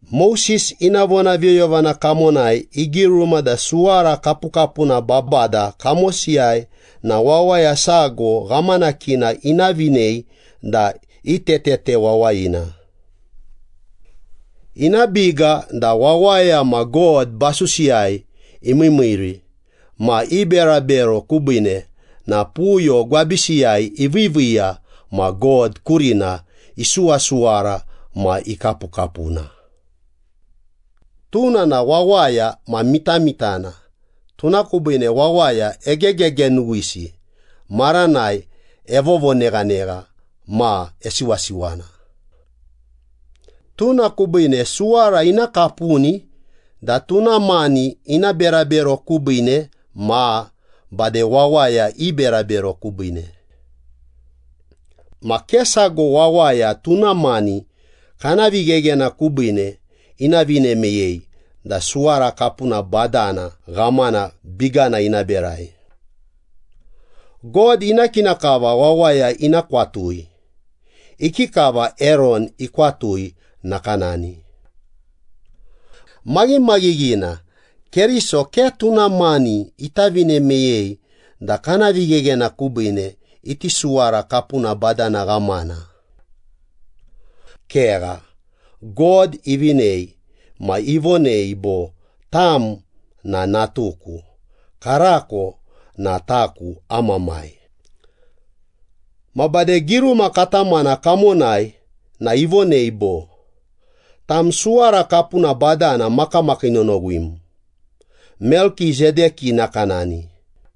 Moses ina vonaviyoyovana kamonai igiruma da suwara kapukapuna babada kamosiyai na wawaya sago ghamanakina ina vinei da i tetete wawayina. Ina biga da wawaya ma God basusiyai imiimiiri ma i berabero kubiine na puyo gwabisiyai iviiviiya ma God kurina isuwasuwara ma ikapukapuna. Tuna na wawaya ma mitamitana, tuna kubiine wawaya egegegenuwisi maranai evovoneghanegha ma esiwasiwana. Tuna kubiine suwara ina kapuni da tuna mani ina berabero kubiine ma bade wawaya i berabero kubiine. Ma ke sago wawaya tuna mani kana vigheghena kubiine ina vine meyei da suwara kapuna badana ghamana bigana ina berai. God ina kina kava wawaya ina kwatui, ikikava Eron ikwatui nakanani. Maghimaghighina, Keriso ke tuna mani ita vine meyei da kana vigheghena kubiine iti suwara kapuna badana ghamana. Kegha, God ivinei ma ivonei bo, “Tam na natuku, karako na taku am Mamai.” Ma bade giruma katamana kamonai na ivonei bo, “Tam suwara kapuna badana makamakii nonowim, Melkisedeki nakanani.”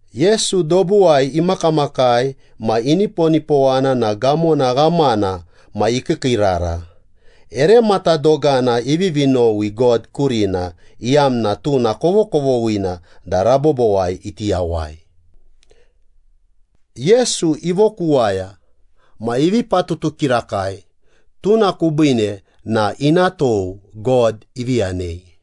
Yesu dobuwai imakamakai ma iniponipowana na gamona ghamana ma ikiikiirara, ere matadogana ivivi nowi God kurina iyamna tuna kovokovoghina da rabobowai iti yawai. Yesu ivokuwaya ma ivi patutu kirakai, tuna kubiine na ina tou God ivi yanei.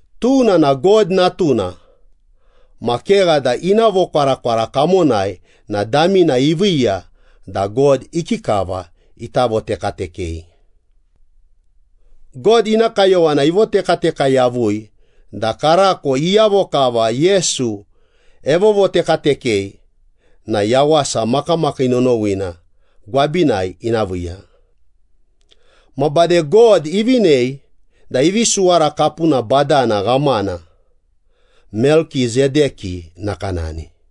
Tuna na God Natuna ma kegha da ina vokwarakwara kamonai na damina iviiya da God ikikava ita votekatekei. God ina kayowana ivotekateka yavui da karako iyavo kava Yesu evovotekatekei na yawasa makamakii nonowina gwabinai ina viiya. Ma bade God ivinei da ivi suwara kapuna badana ghamana, Melkisedeki nakanani.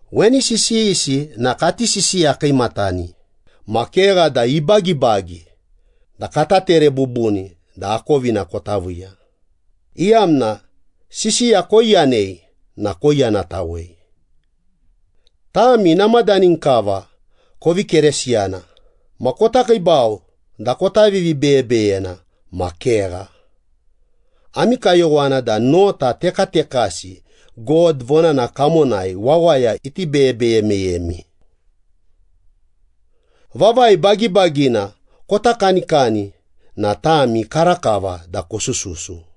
Weni sisiyisi na kati sisiya kiimatani, ma kegha da ibagibagi da kata tere bubuni da akovina kota viiya, iyamna sisiya koiyanei na koiyanatawei. Tami namadani kava kovi Keresiyana ma kota kiibau da kota vivibeyebeyena ma kegha, ami kayowana da nota tekatekasi God vonana kamonai wawaya iti beyebeye meyemi. Vavai bagibagina kota kanikani na tami karakava da kosususu.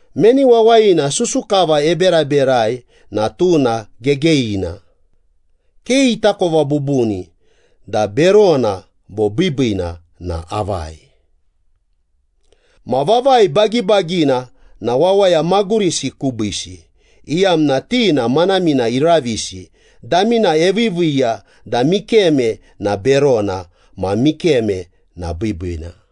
Meni wawayina susu kava eberaberai na tuna gegeyina, ke itakova bubuni da berona bo biibiina na avai. Ma vavai bagibagina na wawaya magurisi kubiisi, iyamna ti na manamina iravisi, damina eviiviiya da mikeme na berona ma mikeme na biibiina.